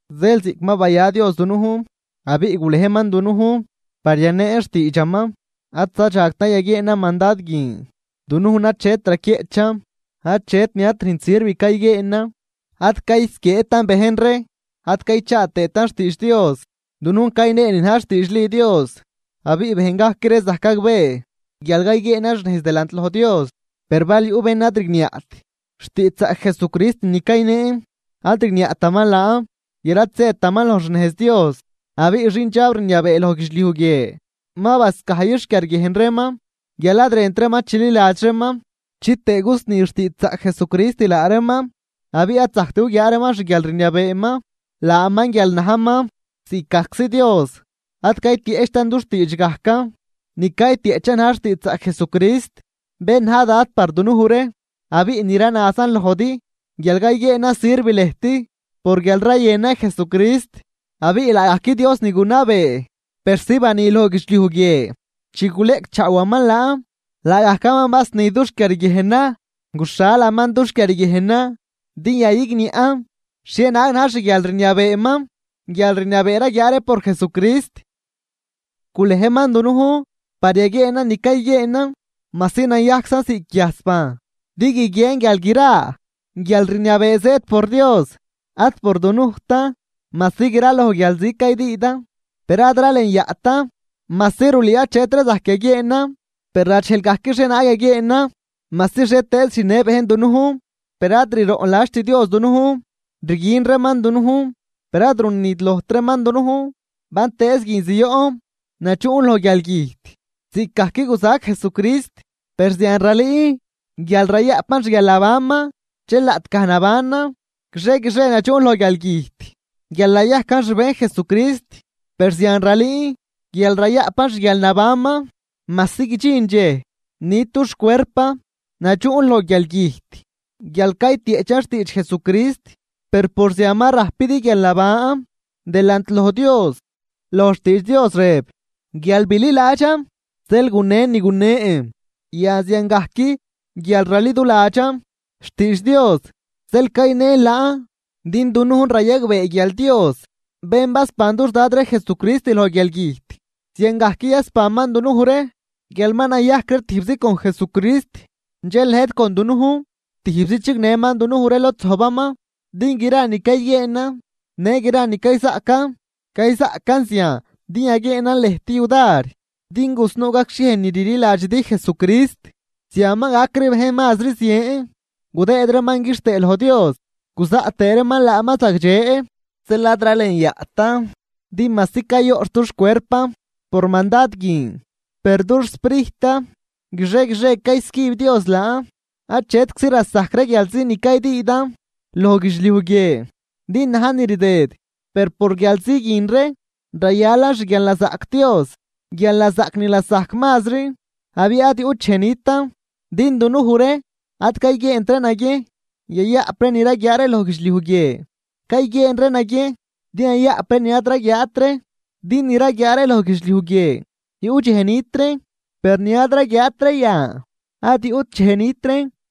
Zeel ziꞌc ma baya Dios dunujn abiꞌ gulejman dunujn par yaneen xtiidxaman, ad zadxagtan yaguieenan mandad guin. Dunujn achet raquieꞌchan, achet ni ad rünjt sirv cayguieenan, ad caysquieetan bejn ree ad caychaa tëëtan xtiidx Dios. Dunujn cayneen ni na̱j xtiidxli Dios, abiꞌ bejn gajc ree zajc gagbee guial cayguieenan xnejz delant loj Dios. Per bal yuꞌ bén ni ad rigniaꞌt xtiidxzaꞌc Jesucrist ni cayneen, ad rigniaꞌtaman laan guial ad zëtaman loj xnejz Dios. Abiꞌ xindxab rniabee loj guidxliuj guie ma bascajyix xquiarguiejn reeman, guial ad rënt reeman chililadx reeman, chitëë gusni xtiidxzaꞌc Jesucrist laa reeman abiꞌ ad zajct guguiaa reeman xguialrniabeeman, laaman guial najman ziꞌc gajczi Dios. Ad caytieꞌchtan dux tiidx gajcan, ni caytieꞌchan na̱j xtiidxzaꞌc Jesucrist, bén na̱j Dad par dunuj ree. Abiꞌ ni ranazan lojdi guial cayguieenan sirv lëjt por guial rayënan Jesucrist. Abiꞌ laagajc Dios ni gunabee persi bani loj guidxliuj guie chi guleꞌcchaawaman laan, laagajcaman basni dux quiarguiejnan, guxhalaman dux quiarguiejnan din yayigniaꞌn xhienaag na̱j xguialrniabeeman, guialrniabee raguiaa ree por Jesucrist. Gulejman dunujn par yaguieenan ni cayguieenan, majsi nayajczan ziꞌc guiajs bajn din guiguien guial gra guialrniabee zëëd por Dios ad por dunujtan. Majsi graloj guialzi caydüüdan per ad ralenyaꞌtan. Majsi rulüü achetri zajc yaguieenan, per radxejl gajc xhienaag yaguieenan. Majsi xhietëëz rüjnnë bejn dunujn, per ad riroꞌnladxt Dios dunujn. Rguin reeman dunujn per ad runidlojt reeman dunujn. Bantëëz guin zioꞌn nadxuꞌn loj guialgüjt ziꞌcgajc guzajc Jesucrist, per zian ralüün guial rayaꞌpan xguialnabanman. Dxel laꞌtgaj nabanan, guixie guixie nadxuꞌn loj guialgüjt guial nayajcan xbejn Jesucrist, per zian ralüün guial rayaꞌpan xguialnabanman, majsi guidxin dxej nit dux cuerpan. Nadxuꞌn loj guialgüjt guial caytieꞌchan xtiidx Jesucrist, per por zian ma rajpidi guialnaban delant loj Dios. Loj xtiidx Dios rëb: “Guial bililadxan, zeel gunen ni gunen.” Yan ziangajc guial raliduladxan xtiidx Dios zeel cayneen laan. Din dunujn rayagbee guial Dios, bén basban dux Dad ree Jesucrist loj guialgüjt, ziangajc yasbanman dunuj ree guial ma nayajcan tijbzi con Jesucrist dxel lëjt con dunujn tijbzi chignëman dunuj ree lod zojbaman. Din gra ni cayguieenan në gra ni cayzaꞌcan, cayzaꞌcan zian din yaguieenan lëjt yudar din gusnuu gacxhiej ni rliladxidi Jesucrist. Zian ma gac ree bejn mazri zien gudëëd reeman quixtëë loj Dios, guzaꞌt tëë reeman laaman zagdxe. Zeel ad ralenyaꞌtan. Din majsi cayoꞌxh dux cuerpan por mandad guin, per dux sprijtan guixie guixie caycüb Dios laan. Achetczi lasajc ree guialzi ni caydüüdan loj guidxliuj guie din najn ni rdëd, per por guialzi guin ree rayalan xguialnazaꞌc Dios, guialnazaꞌc ni lasajc mazri abiꞌ ad yuꞌt dxej nitan. Din dunuj ree ad cayguieent ree naguiejn yayaꞌp ree ni raguiaa ree loj guidxliuj guie, cayguieen ree naguiejn din yayaꞌp ree ni ad raguiaat ree. Din ni raguiaa ree loj guidxliuj guie yuꞌ dxej nit reen, per ni ad raguiaat ree yan ad yuꞌt dxej nit reen.